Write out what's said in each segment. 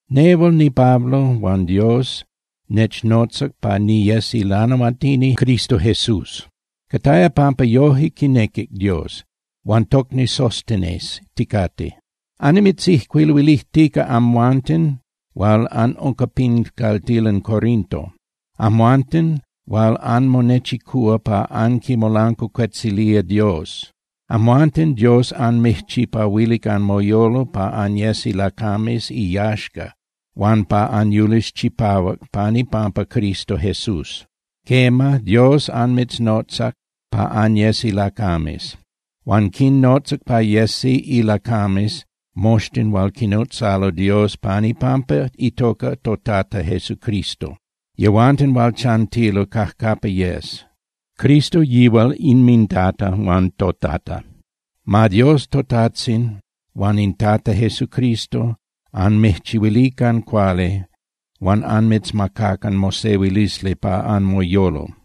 Nehual niPablo huan Dios nechnotzac pa niyes ilanahuatini Cristo Jesús. Cataya pampa yoje quinequic Dios. Huan tocni Sóstenes ticate. Annimitzijcuiluilijtica amhuanten hual anunca pin caltilan Corinto, amhuanten hual anmonechicúa pa anquimolancuacuetzilía Dios. Amhuanten Dios anmijchipahuilic anmoyolo pa anyes ilacames iyaxca huan pa anyulis chipahuac pan ipampa Cristo Jesús. Quema, Dios anmitznotzac pa anyes ilacames. Huan quinnotzac pa yesi ilacames moxtin hual quinotzalo Dios pan ipampa itoca toTata Jesucristo, yehuanten hual chantilo cajcapa yes. Cristo yihual inminTata huan toTata. Ma Dios toTajtzin huan in Tata Jesucristo anmijchihuilican cuali huan anmitzmacacan mosehuilisli pa anmoyolo.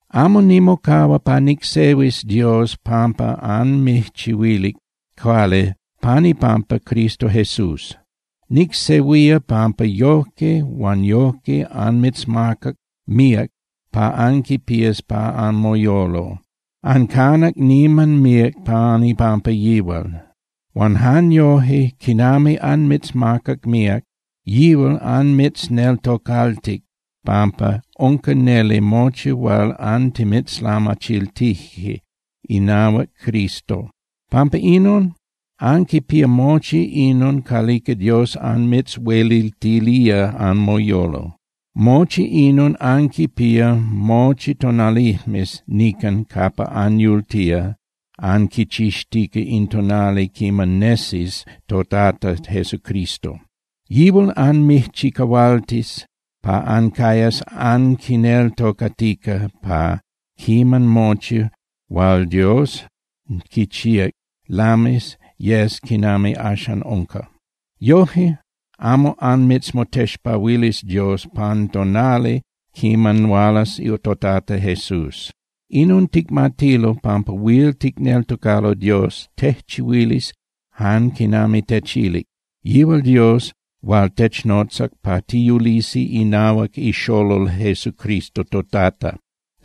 Amo nimocahua pa nicsehuis Dios, pampa anmijchihuilic cuali pan ipampa Cristo Jesús. Nicsehuía pampa yojque huan yojque anmitzmacac míac pa anquipías pa anmoyolo. Ancanac niman míac pan ipampa yihual. Huan jan yoje, quinami anmitzmacac míac, yihual anmitzneltocaltic pampa unca neli mochi hual antimitzlamachiltije inahuac Cristo. Pampa inon, anquipía mochi inon calica Dios anmitzhueliltilía anmoyolo. Mochi inon anquipía mochi tonalijmes nican capa anyultía anquichixtica in tonali quiman nesis toTata Jesucristo. Yihual anmijchicahualtis pa ancayas anquineltocatica pa quiman mochi hual Dios quichíac lamis yes quinami axan unca. Yoje amo anmitzmotexpahuilis Dios pan tonali quiman hualas toTata Jesús. Inon ticmatilo pampa huil ticneltocalo Dios tejchihuilis jan quinami techilic, yihual Dios hual technotzac pa tiyulisi inahuac iXolol Jesucristo toTata.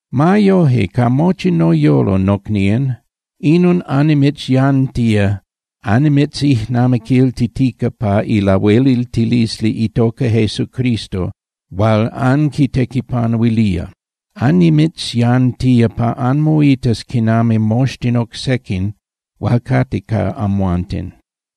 Ma yoje, ca mochi noyolo, nocnían, inon annimitzyantía annimitzijnamiquiltitica ca ilahueliltilisli itoca Jesucristo hual anquitequipanuilía. Annimitzyantía pa anmoitas quinami moxtin oc sequin hual cate ca amhuanten.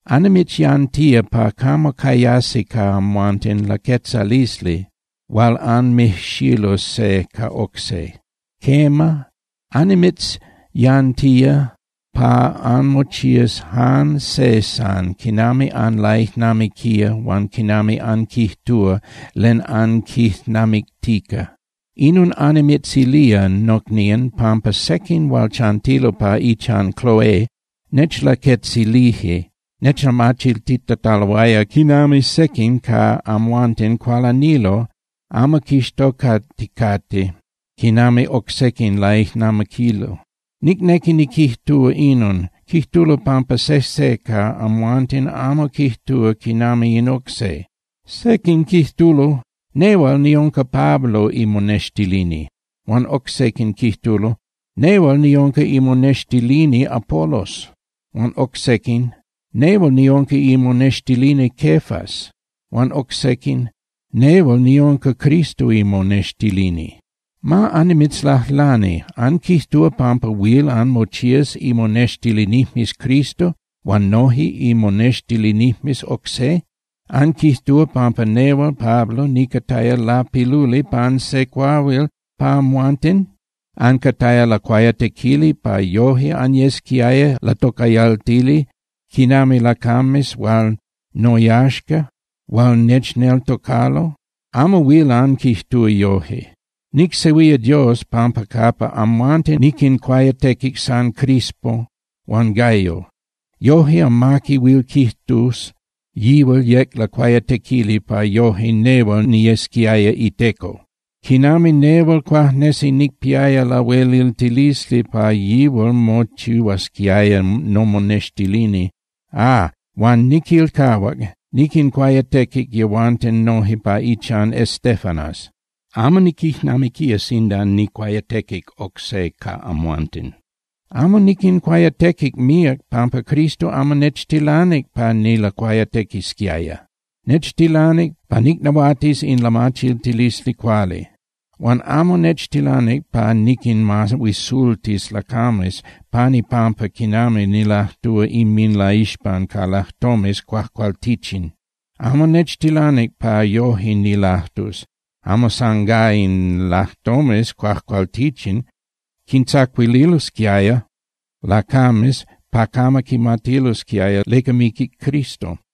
Annimitzyantía pa camo cayasi ca amhuanten laquetzalisli hual anmijxilus se ca oc se. Quema, annimitzyantía pa anmochías jan se san quinami anlaijnamiquía huan quinami anquijtúa len anquijnamictica. Inon annimitzilía, nocnían, pampa sequin hual chantilo pa ichan Cloé nechlaquetzilije nechlamachiltitataloaya quinami sequin ca amhuanten cualanilo amo quixtocaticate quinami oc sequin laijnamiquilo. Nicnequi niquijtúa inon, quijtulo pampa sejse ca amhuanten amo quijtúa quinami in oc se. Sequin quijtulo: “Nehual niunca Pablo imonextilini”, huan oc sequin quijtulo: “Nehual niunca imonextilini Apolos”, huan oc sequin: “Nehual niunca imonextilini Cefas”, huan oc sequin: “Nehual niunca Cristo imonextilini.” Ma annimitzlajlani, ¿anquijtúa pampa huil anmochías imonextilinijmes Cristo huan noje imonextilinijmes oc se? ¿Anquijtúa pampa nehual Pablo nicataya lapiluli pan se cuahuil pa amhuanten? ¿Ancataya lacuayatequili pa yoje anyesquiaya latocayaltili quinami lacames hual noyaxca, hual nechneltocalo? Amo huil anquijtúa yoje. Nicsehuía Dios pampa capa amhuanten niquincuayatequic san Crispo huan Gayo. Yoje amaqui huil quijtus yihual yec lacuayatequili pa yoje nehual niyesquiaya iteco, quinami nehual cuajnesi nicpiaya lahueliltilisli pa yihual mochihuasquiaya nomonextilini. Ah, huan niquilcahuac, niquincuayatequic yehuanten noje pa ichan Estéfanas. Amo niquijnamiquía sinda nijcuayatequic oc se ca amhuanten. Amo niquincuayatequic míac pampa Cristo amo nechtilanic pa nilacuayatequisquiaya. Nechtilanic pa nicnahuatis in lamachiltilisli cuali. Huan amo nechtilanic pa niquinmahuisultis lacames pan ipampa quinami nilajtúa inminlaixpan ca lajtomes cuajcualtichin. Amo nechtilanic pa yoje nilajtus, amo sangá in lajtomes cuajcualtichin quintzacuililosquiaya lacames pa camo quimatilosquiaya leca miquic Cristo.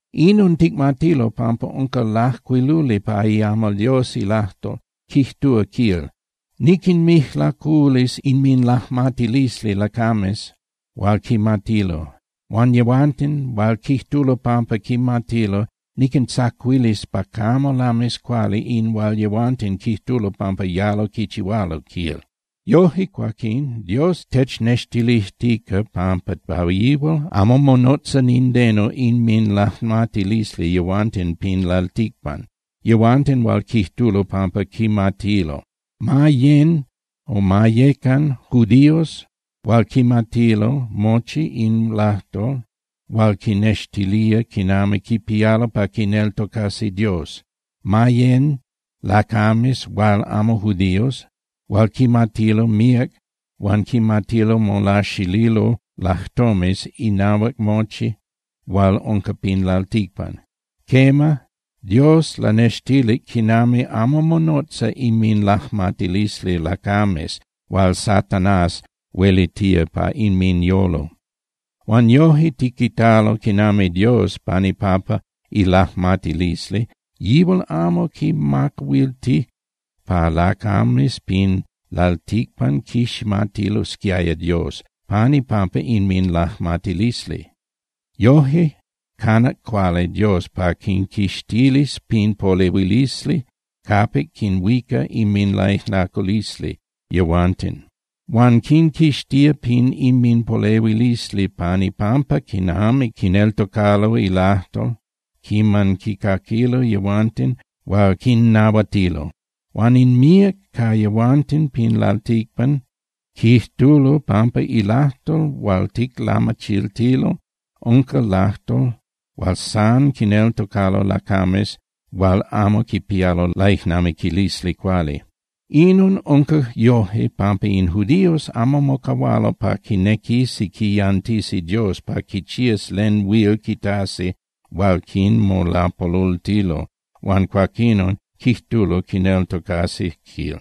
Inon ticmatilo pampa unca lajcuiluli pa iamal Dios ilajtol, quijtúa, quil: Niquinmijlaculis inminlajmatilisli lacames hual quimatilo. Huan yehuanten hual quijtulo pampa quimatilo, niquintzacuilis pa camo lamis cuali in hual yehuanten quijtulo pampa yalo quichihualo, quil. Yoje cuaquín, Dios technextilijtica pampa pa yihual, amo monotza nindeno inminlajmatilisli yehuanten pin lalticpan, yehuanten hual quijtulo pampa quimatilo, ma yén (yecan) judíos hual quimatilo mochi in lajtol hual quinextilía quinami quipialo pa quineltocasi Dios, ma yecan lacames hual amo judíos hual quimatilo míac huan quimatilo molaxililo lajtomes inahuac mochi hual unca pin lalticpan. Quema, Dios lanextilic quinami amo monotza inminlajmatilisli lacames hual Satanás huelitía pa inminyolo. Huan yoje tiquitalo quinami Dios, pan ipampa ilajmatilisli yihual amo quimacahuiltic pa lacames pin lalticpan quiximatilosquiaya Dios pan ipampa inminlajmatilisli. Yoje canac cuali Dios pa quinquixtilis pin polehuilisli capic quinhuica inminlaijlaculisli yehuanten. Huan quinquixtía pin inminpolehuilisli pan ipampa quinami quineltocalo ilajtol quiman quincaquilo yehuanten hual quinnahuatilo. Huan in míac ca yehuanten pin lalticpan quijtulo pampa ilajtol hual ticlamachiltilo unca lajtol hual san quineltocalo lacames hual amo quipialo laijnamiquilisli cuali. Inon unca yoje pampa in judíos amo mocahualo pa quinequisi quiyantisi Dios pa quichías len huil quitasi hual quinmolapolultilo huan cuaquinon, quijtulo, quineltocasi, quil.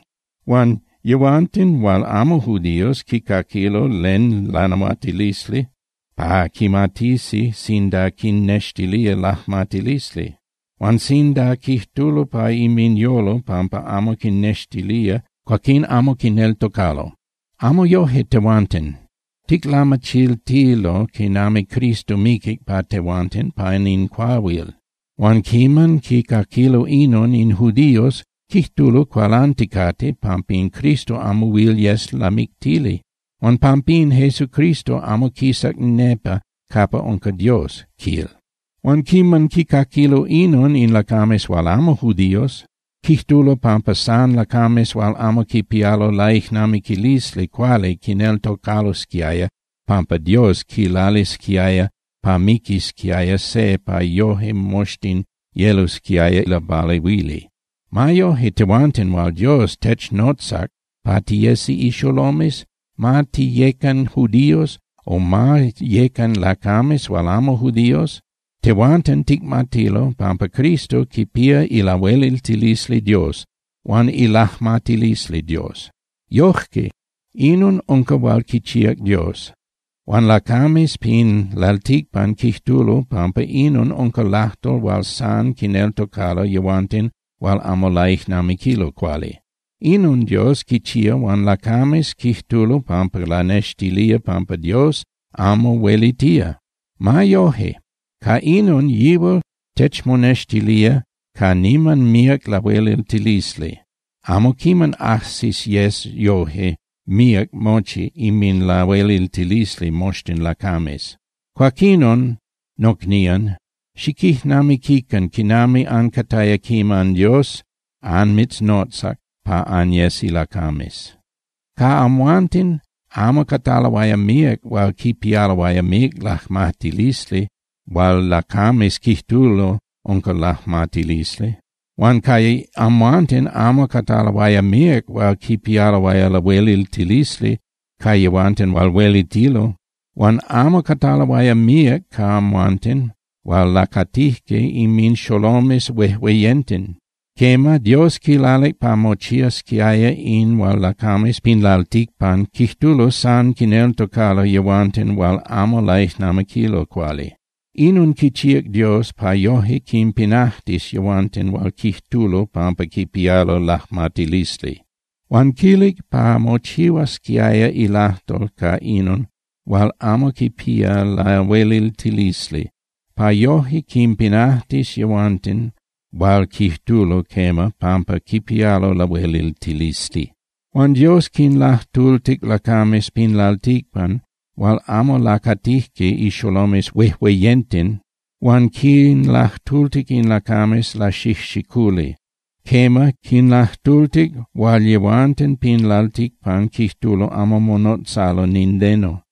Huan yehuanten hual amo judíos quicaquilo len lanahuatilisli pa quimatisi sinda quinnextilía lajmatilisli. Huan sinda quijtulo pa inminyolo pampa amo quinnextilía, cuaquín amo quineltocalo. Amo yoje tehuanten. Ticlamachiltilo quinami Cristo miquic pa tehuanten pan in cuahuil. Huan quiman quicaquilo inon in judíos, quijtulo cualanticate pampa in Cristo amo huil yes lamictili, huan pampín Jesucristo amo quisac nepa capa unca Dios, quil. Huan quiman quicaquilo inon in lacames hual amo judíos, quijtulo pampa san lacames hual amo quipialo laijnamiquilisli cuali quineltocalosquiaya pampa Dios quilalisquiaya pa miquisquiaya se pa yoje moxtin yelosquiaya lapalehuili. Ma yoje, tehuanten hual Dios technotzac pa tiyesi ixolomes, ma tiyén (tiyecan) judíos o ma yén (yecan) lacames hual amo judíos, tehuanten ticmatilo pampa Cristo quipía ilahueliltilisli Dios huan ilajmatilisli Dios. Yoje, inon unca hual quichíac Dios. Huan lacames pin lalticpan quijtulo pampa inon unca lajtol hual san quineltocalo yehuanten hual amo laijnamiquilo cuali. Inon Dios quichía huan lacames quijtulo pampa lanextilía pampa Dios amo huelitía. Ma yoje, ca inon yihual techmonextilía ca niman míac lahueliltilisli. Amo quiman ajsis yes yoje míac mochi inminlahueliltilisli moxtin lacames. Cuaquinon, nocnían, xiquijnamiquican quinami ancataya quiman Dios anmitznotzac pa anyes ilacames. Ca amhuanten amo cataloaya míac hual quipialoaya míac lajmatilisli hual lacames quijtulo unca lajmatilisli. Huan ca amhuanten amo cataloaya míac hual quipialoaya lahueliltilisli ca yehuanten hual huelitilo. Huan amo cataloaya míac ca amhuanten hual lacatijque inminxolomes huejueyenten. Quema, Dios quilalic pa mochiasquiaya in hual lacames pin lalticpan quijtulo san quineltocalo yehuanten hual amo laijnamiquilo cuali. Inon quichíac Dios pa yoje quinpinajtis yehuanten hual quijtulo pampa quipialo lajmatilisli. Huan quilalic pa mochihuasquiaya ilajtol ca inon hual amo quipía lahueliltilisli pa yoje quinpinajtis yehuanten hual quijtulo, quema, pampa quipialo lahueliltilisli. Huan Dios quinlajtultic lacames pin lalticpan hual amo lacatijque ixolomes huejueyenten, huan quinlajtultic in lacames laxijxiculi. Quema, quinlajtultic hual yehuanten pin lalticpan quijtulo amo monotzalo nindeno,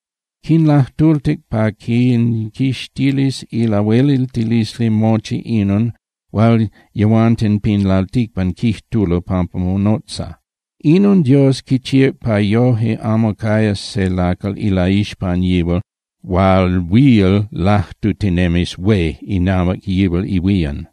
quinlajtultic pa quinquixtilis ilahueliltilisli mochi inon hual yehuanten pin lalticpan quijtulo pampa monotza. Inon Dios quichíac pa yoje amo cayas se lacal ilaixpan yihual hual huil lajtutinemis hué inahuac yihual ihuían.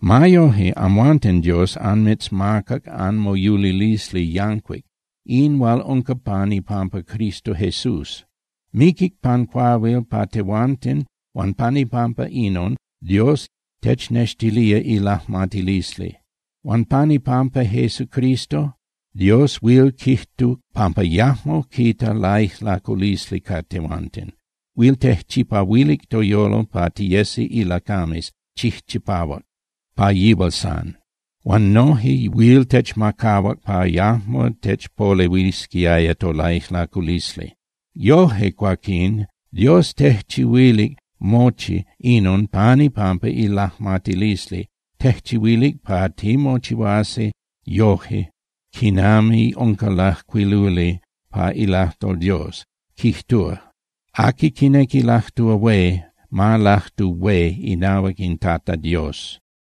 Ma yoje, amhuanten Dios anmitzmacac anmoyulilisli yancuic, in hual unca pan ipampa Cristo Jesús. Miquic pan cuahuil pa tehuanten huan pan ipampa inon, Dios technextilía ilajmatilisli. Huan pan ipampa Jesucristo, Dios huil quijtuc pampa yajmo quita laijlaculisli ca tehuanten. Huil tejchipahuilic toyolo pa tiyesi ilacames chijchipahuac pa yihual san. Huan noje huil techmacahuac pa yajmo techpolehuisquiaya tolaijlaculisli. Yoje cuaquín, Dios tejchihuilic mochi inon pan ipampa ilajmatilisli, tejchihuilic pa timochihuasi yoje quinami unca lajcuiluli pa ilajtol Dios, quijtúa: “Aqui quinequi lajtúa hué, ma lajtu hué inahuac in Tata Dios.”